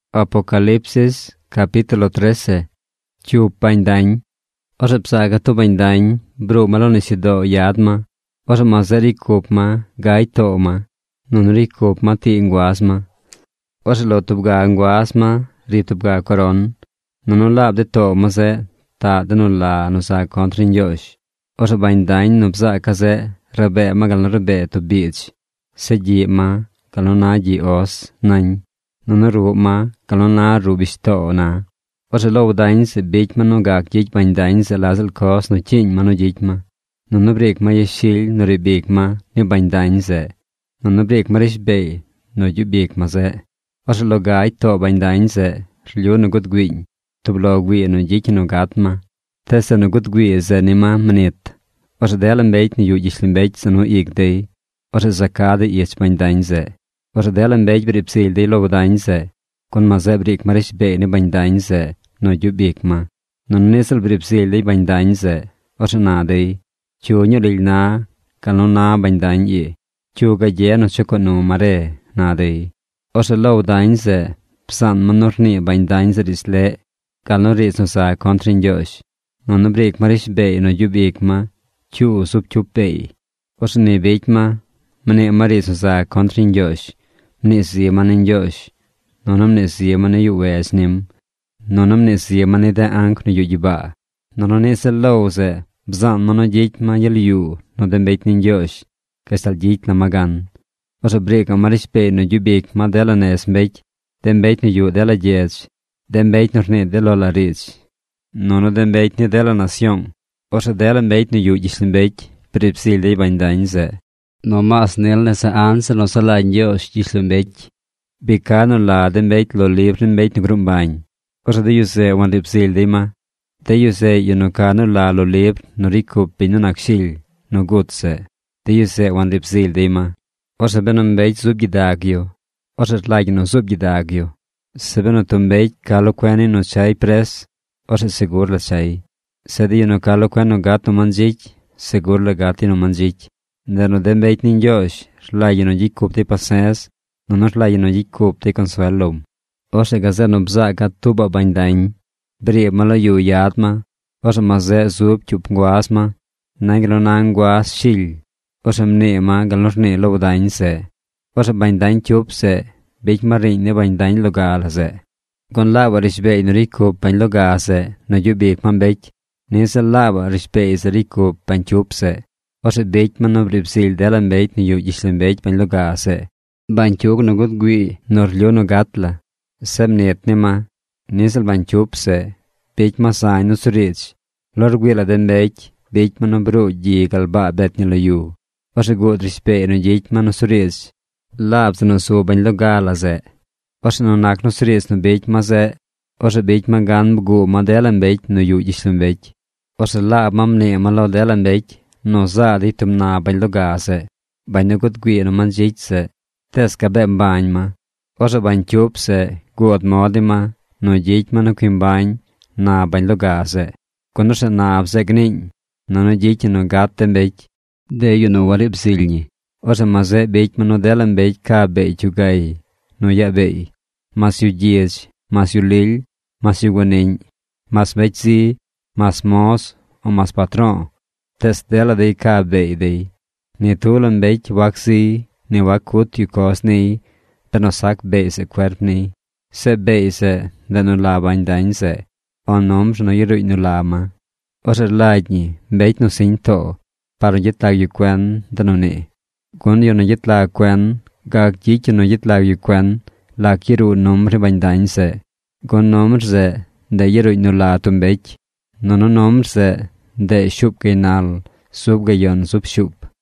Orzeꞌ low dañ zeꞌ, ma zeꞌ gusu ma ruꞌ nisyudoo. Cyup bañ dañ Orzeꞌ bzaaca̱ tub bañ dañ bruu ma lo nisyudoo yad ma. Orzeꞌ ma zeꞌ ricy cup ma gagy too ma. Nunu ricy cup ma tii nguaz ma. Orzeꞌ lo tub ga nguaz ma ri tub ga coron. Nunu laab de too ma zeꞌ taꞌ de nu la nu za contr ni Ñgyoozh. Orzeꞌ bañ dañ nu bzaaca̱ zeꞌ rabee ma gal nu rabee tub biidz. Zeꞌ gyiꞌ ma gal nu na gyiꞌ os nañ. Nunu ruꞌ ma gal nu na ruꞌ bishtoo na. Orzeꞌ low dañ zeꞌ bicy ma nu gac gyicy bañ dañ zeꞌ la ziꞌl coz nu cyiiñ ma nu gyicy ma. Nunu briic ma yashily nu riib ic ma, ni bañ dañ zeꞌ. Nunu briic ma rishbeey nu gyub ic ma zeꞌ. Orzeꞌ lo gagy too bañ dañ zeꞌ, rlyu nu gud güiiñ, tub lo güii nu gyicy ñi nu gat ma. Tees zeꞌ nu gud güii zeꞌ ni ma mnit. Orzeꞌ dela mbecy nu yuꞌ gyishlombecy za nu ic dey. Orzeꞌ za ca dey ich bañ dañ zeꞌ. Orzeꞌ dela mbecy briib zily dey low dañ zeꞌ, gun ma zeꞌ briic ma rishbeey ni bañ dañ zeꞌ nu gyub ic ma. Nunu niꞌ ziꞌl briib zily dey bañ dañ zeꞌ. Orzeꞌ na dey: ―¿Cyu ñuu lily na gal nu na bañ dañ ii? ¿Cyu gagye nu chucoo nu ma re? ―na dey. Orzeꞌ low dañ zeꞌ bzaan ma nu rnii bañ dañ zeꞌ riidz leꞌ gal nu riidz nu za contr ni Ñgyoozh. Nunu briic ma rishbeey nu gyub ic ma cyuu zub cyup beey. Orzeꞌ ni bicy ma. Mnii ma riidz nu za contr ni Ñgyoozh. Mnii zi ma ni Ñgyoozh, nunu mnii zi ma ni yuꞌ wedz nim, nunu mnii zi ma ni de anc nu yuꞌ gyibaa. Nunu niꞌ ziꞌl low zeꞌ bzaan ma nu gyicy ma gyel yuu nu de mbecy ni Ñgyoozh gashtal gyicy la ma gan. Orzeꞌ briicaꞌ ma rishbeey nu gyub ic ma dela nez mbecy, de mbecy nu yuꞌ dela gyedz, de mbecy nu rnii de lo la riidz, nunu de mbecy ni dela nasyoong. Orzeꞌ dela mbecy nu yuꞌ gyishlombecy briib zily dey bañ dañ zeꞌ. Nomaas nil nese anzir nu saꞌ lagy Ñgyoozh gyishlombecy, bi ca nu la de mbecy lo libr ni mbecy nu gruu mbañ. Orzeꞌ de yu zeꞌ wanriib zily dey ma. De yu zeꞌ yu nu ca nu la lo libr nu ricy cup biñ nu nac Shily nu gut zeꞌ, de yu zeꞌ wanriib zily dey ma. Orzeꞌ benu mbecy zub gyidag yu, orzeꞌ rlagy ñi nu zuub gyidag yu. Zeꞌ benu tub mbecy ca lo cuen niy nu chay pres, orzeꞌ segur la chay. Zeꞌ de yu nu ca lo cuen nu gat nu mandzicy, segur la gat dey nu mandzicy. Ndeꞌ nu de mbecy ni Ñgyoozh rlagy ñi nu gyicy cup dey pase̱z nunu rlagy ñi nu gyicy cup dey consuel lom. Orzeꞌ gazeꞌ nu bzaaca̱ tuubaꞌ bañ dañ. Briib ma lo yu yad ma. Orzeꞌ ma zeꞌ zub cyup nguaz ma. Nañ gal nu na nguaz shily. Orzeꞌ mnii ma gal nu rnii low dañ zeꞌ. Orzeꞌ bañ dañ cyup zeꞌ bicy ma riiñ ni bañ dañ loga la zeꞌ. Gun laabaꞌ rishbeey nu ricy cup bañ loga zeꞌ nu gyub ic ma mbecy, niꞌ ziꞌl laabaꞌ rishbeey zeꞌ ricy cup bañ cyup zeꞌ. Orzeꞌ bicy ma nu briib zily dela mbecy nu yuꞌ gyishlombecy bañ loga zeꞌ, bañcyug nu guud güii nu rlyu nu gat la. Zeꞌ mnit ni ma. Niꞌ ziꞌl bañ cyup zeꞌ bicy ma zañ nusuriidz. Lo rgüii la de mbecy bicy ma nu bruu gyi gal baa bet ñi lo yu. Orzeꞌ guud rishbeey nu gyicy ma nusuriidz laab zeꞌ nu zu bañ loga la zeꞌ. Orzeꞌ nu nac nusuriidz nu bicy ma zeꞌ, orzeꞌ bicy ma gan bguu ma dela mbecy nu yuꞌ gyishlombecy. Orzeꞌ laab ma mnii ma lo dela mbecy nu zaa dey tub nab bañ loga zeꞌ, bañ nu gud güii nu mandzicy zeꞌ, tees gabee mbañ ma. Orzeꞌ bañ cyup zeꞌ guud mod ni ma nu gyicy ma nu cui mbañ nab bañ loga zeꞌ, gun orzeꞌ nab zeꞌ gniiñ, nunu gyicy ñi nu gat de mbecy, de yu nu wariib zily ñi. Orzeꞌ ma zeꞌ bicy ma nu dela mbecy ca beey cyugay gal nu yaa beey. Mas yu gyidz, mas yu lily, mas yu guaniꞌñ, mas mbecy zi, mas moz, o mas patro̱o̱, tees dela dey ca beey dey. Ni tub la mbecy wac ziy, ni wac cut yu coz niy benu sac beey zeꞌ cuerp niy. Zeꞌ beey zeꞌ, ndeꞌ nu la bañ dañ zeꞌ, o numbr nu yaruuñ nu la ma. Orzeꞌ rlagy ñi mbecy nu siñ too par nu gyet lag yu cuen de nu nii. Gun yu nu gyet lag cuen gac gyicy yu nu gyet lag yu cuen lac yaruu numbr ni bañ dañ zeꞌ. Gun numbr zeꞌ, ndeꞌ yaruuñ nu la tub mbecy. Nunu numbr zeꞌ, ndeꞌ shuup gaynal zub gayon zub shuup.